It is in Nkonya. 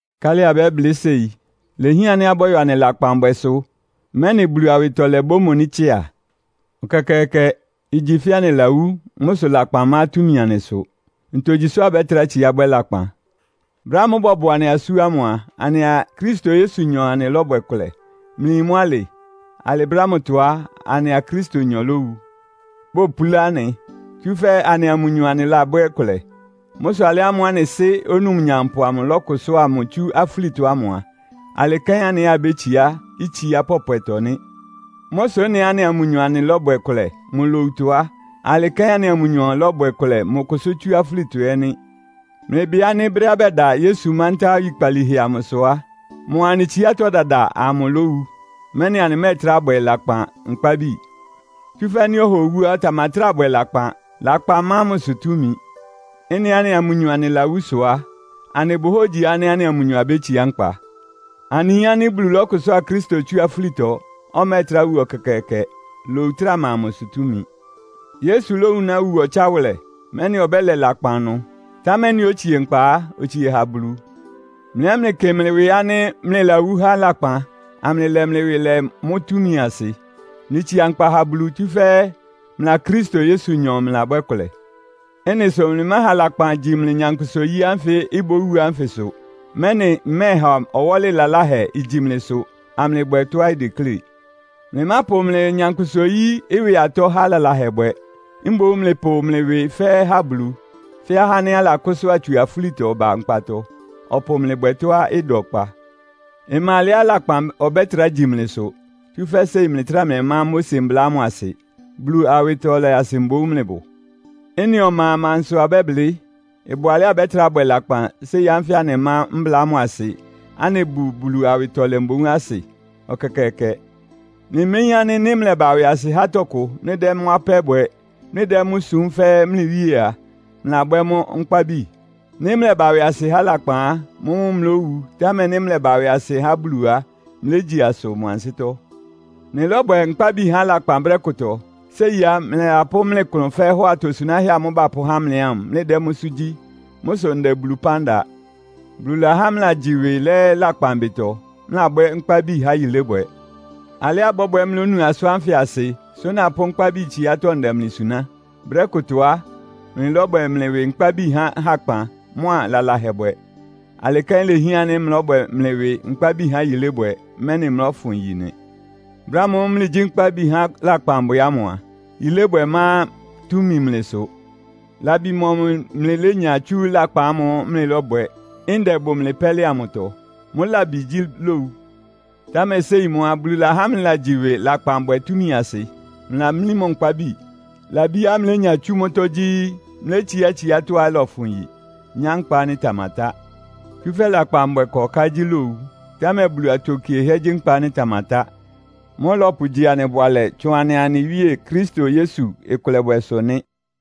Nkálɩ abɛ́blɩ́ séi? Ilehián ánɩ́ abɔ́yɔ anɩ lakpanbwɛsʋ, mɛ́nɩ Bulu awɩtɔlɛ bómoní tsɩ́a? Ɛkɛkɛɛkɛ! Igyi fɛ́ anɩlawú, mʋ́ sʋ lakpan ma túmi anɩsʋ. Ntogyi sʋ abɛ́trá tsiá bwɛ́ lakpan? Brɛ́ ámʋ́ʋ́ bɔbɔ anɩ asú ámʋ a, anɩa Kristo Yesunyɔ anɩlɔ́bwɛ kʋlɛ. Mlɩyin mʋ́ alɩ? Alɩ brɛ́ ámʋtɔ á, anɩa Kristonyɔ lówu, bopulá anɩ, tsúfɛ́ anɩa mʋnyɔ anɩlabwɛ́ kʋlɛ. Mʋ́ sʋ alɩ ámʋ́ʋ́ anɩ Sɩ́ Onumnyampʋ amʋ lɔ́kʋsʋ́a mʋ tsú afúlitɔ ámʋ a, alɩ kɛ́n anɩ ɛ́ abétsiá itsiá pɔpwɛtɔ nɩ́. Mʋ́ sʋ ɩ́nɩá anɩa mʋnyɔ anɩlɔ́bwɛ kʋlɛ mʋ lowutɔ á, alɩ kɛ́n anɩa mʋnyɔ lɔ́bwɛ kʋlɛ mʋ kʋsʋ́ tsú afúlitɔ ɛ́ nɩ́. Mlɩbɩ ánɩ́ brɛ́á bɛda Yesu mántá oyikpalíhɛ amʋsʋ á, mʋa anɩ tsiátɔ́ dada amʋ lówu, mɛ́nɩ anɩmɛ́ɛtrá bwɛ lakpan nkpábi. Tsúfɛ́ nɩ́ ɔha owú á, ɔtamatráa bwɛ lakpan. Lakpan má mʋsʋ túmi. Ɩ́nɩá anɩa mʋnyɔ anɩlawú sʋ á, anɩbʋ hógyi ánɩ́ anɩa mʋnyɔ abétsiá nkpa. Anɩyin ánɩ́ Bulu lɔ́kʋsʋ́a Kristo tsú afúlitɔ. Ɔmɛ́ɛtrá wu ɛkɛkɛɛkɛ. Lowu ɩtráa ma mʋsʋ túmi. Yesu lówunáa wu ɔtsáwʋlɛ, mɛ́nɩ ɔbɛ́lɛ lakpan ɩnʋ. Támɛ ɩ́nɩá otsie nkpa á, otsie ha Bulu. Mlɩ ɛ́ mlɩkɩ mlɩ ɩwɩ ánɩ́ mlɩlawú há lakpan, amlɩlɛ mlɩ ɩwɩ lɛ mʋ́ túmi asɩ. Mlɩtsia nkpa ha Bulu, tsúfɛ́ mlɩa Kristo Yesunyɔ mlɩlabwɛ́ kʋlɛ. Ɩ́nɩ sʋ mlɩmáha lakpan igyi mlɩ nyankpʋsa-oyí ánfɩ ibówu ánfɩsʋ, mɛ́nɩ ɩmɛ́ɛha ɔwɔ́lɩ laláhɛ igyi mlɩsʋ, amlɩbwɛ tɔ́á ideklé. Mlɩmápʋ mlɩ nyankpʋsa-oyí ɩwɩ atɔ́ há lalahɛbwɛ. Mboún mlɩpʋ mlɩ ɩwɩ fɛ́ɛ́ ha Bulu, fɛ́ ahá ánɩ́ alakʋ́sʋ́a amʋ́ tsú afúlitɔ ba nkpatɔ, ɔpʋ mlɩ bwɛ tɔ́á ɩda ɔkpa. Ɩma alɛá lakpan ɔbɛ́trá gyi mlɩsʋ, tsúfɛ́ séi mlɩtráa mlɩmá Mose Mbla ámʋ asɩ. Bulu awɩtɔlɛ asɩ mboún mlɩbʋ. Ɩ́nɩ ɔma a, amansʋ abɛ́blɩ́? Ɩbʋ alɛ́á abɛ́trá bwɛ lakpan séi ánfɩ ánɩmá mbla ámʋ asɩ, anɩbʋ Bulu awɩtɔlɛ mboún asɩ? Ɛkɛkɛɛkɛ! Mlɩméyín ánɩ́ nɩ́ mlɛba ɩwɩasɩ há tɔkʋ, mlɩdɛ́ mʋ́ apɛ́ bwɛ, mlɩdɛ́ mʋ́ súm fɛ́ mlɩ wíe a, mlɩlabwɛ́ mʋ́ nkpábi? Nɩ́ mlɛba ɩwɩasɩ há lakpan á, mʋ́mʋ́ mlówu, támɛ nɩ́ mlɛba ɩwɩasɩ há Bulu á, mlégyi asʋ mʋ ansɩ́tɔ́. Mlɩlɔ́bwɛ nkpábi há lakpan brɛ́ kʋtɔ. Séi á, mlɩlapʋ́ mlɩ klʋn fɛ́ɛ́ hɔ atosunáhɛ́ amʋ́ʋ́ bapʋ́há mlɩ ámʋ, mlɩdɛ́ mʋ́sʋ́ gyí. Mʋ́ sʋ ndɛ Bulu ɩpán da. Bulu lahá mlɩlagyi ɩwɩ lɛ́ lakpan ɩbɩtɔ, mlɩlabwɛ́ nkpábi há yilébwɛ. Alɩá ɩbɔ́bwɛ mlónu asʋ́n ánfɩ asɩ, sʋ́ napʋ́ nkpábi tsiátɔ́ ndɛ mlɩ suná. Brɛ́ kʋtɔ á, mlɩlɔ́bwɛ mlɩ ɩwɩ nkpábi há hakpan mʋ́a lalahɛbwɛ. Alɩ kɛ́n ilehián ánɩ́ mlɔ́bwɛ mlɩ ɩwɩ nkpábi ha yilébwɛ, mɛ́nɩ mlɔ́fʋn yi nɩ. Brɛ́ ámʋ́ʋ́ mlɩgyí nkpábi há lakpanbwɛ ámʋ a, yilébwɛ má túmi mlɩsʋ. Labi mɔmʋ mlɩlénya tsú lakpan ámʋ́ʋ́ mlɩlɔ́bwɛ, ndɛ ɩbʋ mlɩ pɛ́lɩ amʋtɔ? Mʋ́ labi gyí lowu. Támɛ séi mʋ́ á, Bulu lahá mlɩlagyi ɩwɩ lakpanbwɛ túmi asɩ. Mlɩlamlí mʋ nkpábi. Labiá mlénya tsú mʋ́tɔ́ gyí; mlétsiá tsiátɔ́á ɩlɔfʋn yi, nyá nkpa ánɩ́ ɩtamatá. Tsúfɛ́ lakpanbwɛ ɩkɔká gyí lowu, támɛ Bulu atokiehɛ́ gyí nkpa ánɩ́ ɩtamatá. Mʋ́ ɔlɔpʋgyi anɩ bʋalɛ tsʋn anɩa anɩ Wíe Kristo Yesu ɩkʋlɛbwɛsʋ nɩ́.